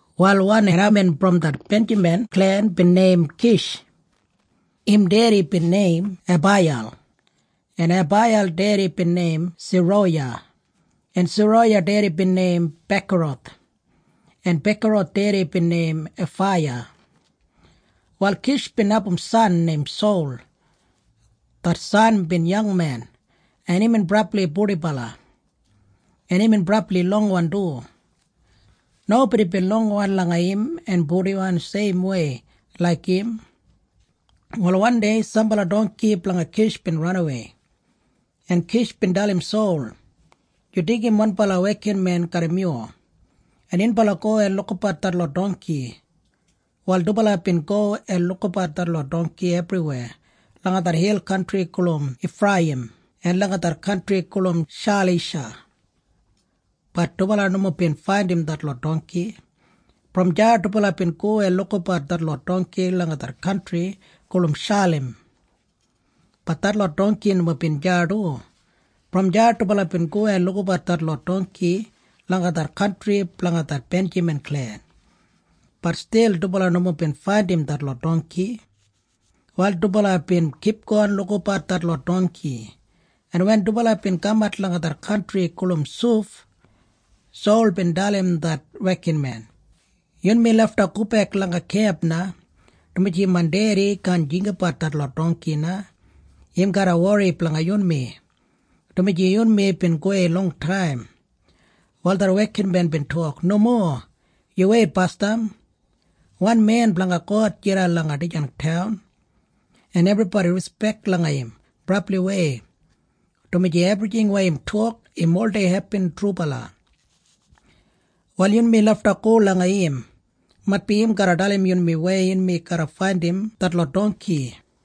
Wal wan haimen brom det Benjamin klen bin neim Kish. Im dedi bin neim Abaiyel, en Abaiyel dedi bin neim Seroya, en Seroya dedi bin neim Bekorath, en Bekorath dedi bin neim Afaiya. Wal Kish bin abum san neim Sol. Det san bin yangmen, en imbin brabli purdibala, en imbin brabli longwan du. Nobodi bin longwan langa im en purdiwan seimwei laik im. Wal wandei sambala dongki blanga Kish bin ranawei, en Kish bin dalim Sol, “Yu deigim wanbala wekinmen garram yu, en yunbala go en lukabat detlot dongki.” Wal dubala bin go en lukabat detlot dongki ebriweya langa det hil kantri gulum Ifreiyim en langa det kantri gulum Shalisha. Bat dubala nomo bin faindim detlot dongki. Brom deya dubala bin go en lukabat detlot dongki langa det kantri gulum Shalim. Bat detlot dongki nomo bin deya du. Brom deya dubala bin go en lukabat detlot dongki langa det kantri blanga det Benjamin klen. Bat stil dubala nomo bin faindim detlot dongki. Wal dubala bin kipgon lukabat detlot dongki, en wen dubala bin kamat langa det kantri gulum Suf, Sol bin dalim det wekinmen, “Yunmi lafta gobek langa kemp na, dumaji main dedi kaan jinggabat detlot dongki na. Im garra wori blanga yunmi, dumaji yunmi bin gowei longtaim.” Wal det wekinmen bin tok, “Nomo. Yu weit basdam. Wan men blanga God jidan langa dijan taun, en ebribodi rispek langa im brabliwei, dumaji ebrijing weya im tok, im oldei hepin trubala. Wal yunmi lafta go langa im. Maitbi im garra dalim yunmi weya yunmi garra faindim detlot dongki.”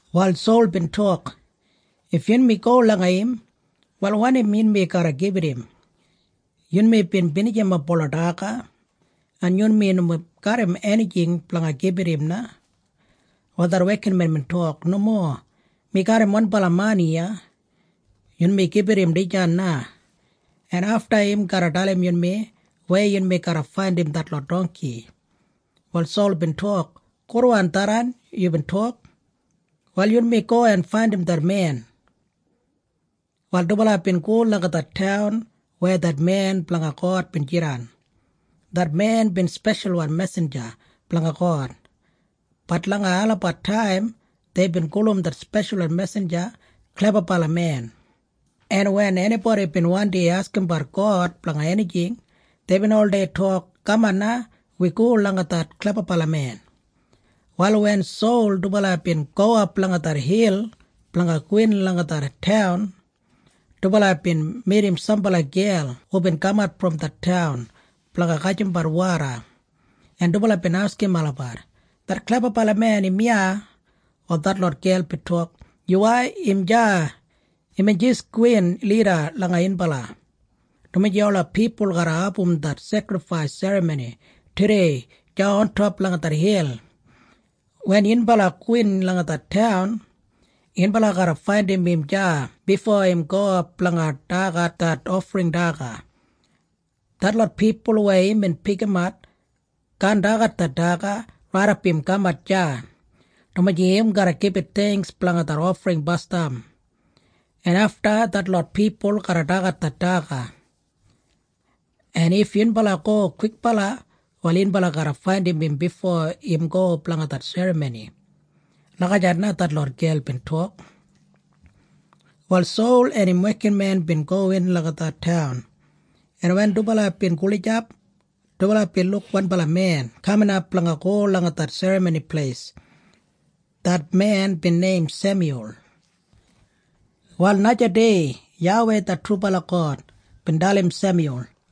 Wal Sol bin tok, “If yunmi go langa im, wal wanim yunmi garra gibit im? Yunmi bin binijimap ola daga, en yunmi nomo garram enijing blanga gibit im na.” Wal det wekinmen bin tok, “Nomo. Mi garram wanbala mani iya. Yunmi gibit im dijan na, en afta im garra dalim yunmi weya yunmi garra faindim detlot dongki.” Wal Sol bin tok, “Gudwan tharran yubin tok. Wal yunmi go en faindim det men.” Wal dubala bin go langa det taun weya det men blanga God bin jidan. Det men bin speshalwan mesinja blanga God. Bat langa olabat taim deibin gulum det speshalwan mesinja klebabalamen, en wen enibodi bin wandi askimbat God blanga enijing, deibin oldei tok, “Kaman na. Wi go langa det klebabalamen.” Wal wen Sol dubala bin gowap langa det hil blanga gowin langa det taun, dubala bin midim sambala gel hubin kamat brom det taun blanga gajimbat woda, en dubala bin askim olabat, “Det klebabalamen im iya?” Wal detlot gel bin tok, “Yuwai. Im deya. Imbin jis gowin lida langa yunbala, dumaji ola pipul garra abum det sekrifais serramoni tudei deya ontop langa det hil. Wen yunbala gowin langa det taun, yunbala garra faindim im deya bifo im gowap blanga dagat det ofring daga. Detlot pipul weya imbin pikimat kaan dagat det daga raidap im kamat deya, dumaji im garra gibit theingks blanga det ofring basdam, en afta detlot pipul garra dagat det daga. En if yunbala go kwikbala, wal yunbala garra faindim im bifo im go blanga det serramoni.” Lagijat na detlot gel bin tok. Wal Sol en im wekinmen bin gowin langa det taun, en wen dubala bin gulijap, dubala bin luk wanbala men kaminap blanga go langa det serramoni pleis. Det men bin neim Semyul. Wal najadei YAWEI det trubala God bin dalim Semyul.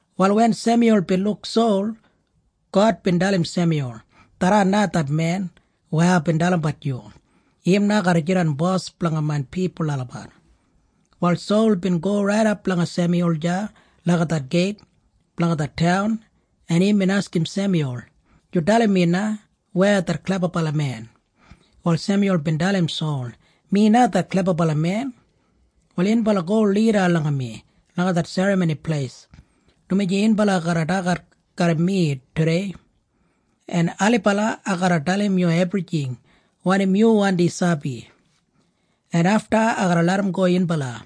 Wal wen Semyul bin luk Sol, God bin dalim Semyul, “Tharran na det men weya aibin dalimbat yu. Im na garra jidan bos blanga main pipul olabat.” Wal Sol bin go raidap langa Semyul deya langa det geit blanga det taun, en imbin askim Semyul, “Yu dalim mi na. Weya det klebabalamen?” Wal Semyul bin dalim Sol, “Mi na det klebabalamen. Wal yunbala go lida langa mi langa det serramoni pleis, dumaji yunbala garra dagat garram mi tudei, en ailibala ai garra dalim yu ebrijing wanim yu wandi sabi, en afta ai garra larramgo yunbala.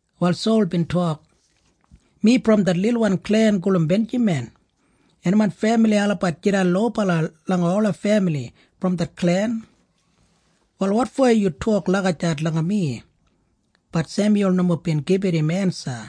Wal Sol bin tok, “Mi brom det lilwan klen gulum Benjamin, en main femili olabat jidan lobala langa ola femili brom det klen. Wal wotfo yu tok lagijat langa mi?” Bat Semyul nomo bin gibit im ensa.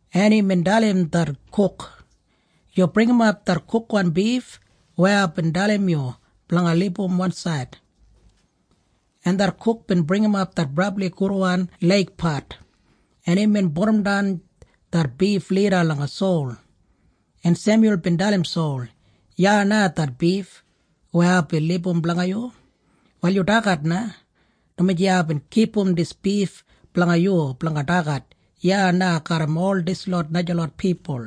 en imbin dalim det kuk, “Yu bringimap det kukwan bif weya aibin dalim yu blanga libum wansaid.” En det kuk bin bringimap det brabli gudwan leigpat, en imbin pudumdan det bif lida langa Sol, en Semyul bin dalim Sol, “Iya na det bif weya aibin libum blanga yu. Wal yu dagat na, dumaji aibin kipum dis bif blanga yu blanga dagat iya na garram ol dislot najalot pipul.”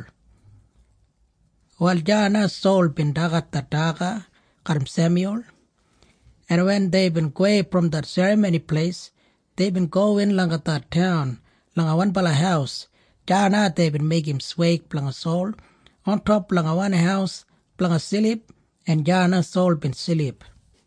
Wal deya na Sol bin dagat det daga garram Semyul, en wen deibin gowei brom det serramoni pleis, deibin gowin langa det taun langa wanbala haus. Deya na deibin meigim sweig blanga Sol ontop langa wan haus blanga silip, en deya na Sol bin silip.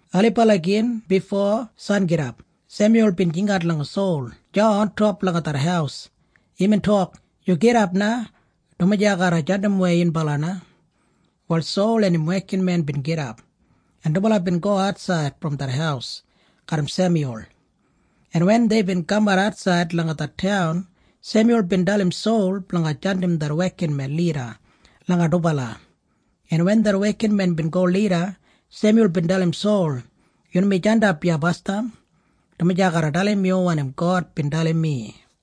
Ailibala gin bifo sangidap Semyul bin jingat langa Sol deya ontop langa det haus. Imbin tok, “Yu gidap na, dumaji ai garra jandimwei yunbala na.” Wal Sol en im wekinmen bin gidap, en dubala bin go atsaid brom det haus garram Semyul. En wen deibin kamat atsaid langa det taun, Semyul bin dalim Sol blanga jandim det wekinmen lida langa dubala, en wen det wekinmen bin go lida, Semyul bin dalim Sol, “Yunmi jandap iya basdam, dumaji ai garra dalim yu wanim God bin dalim mi.”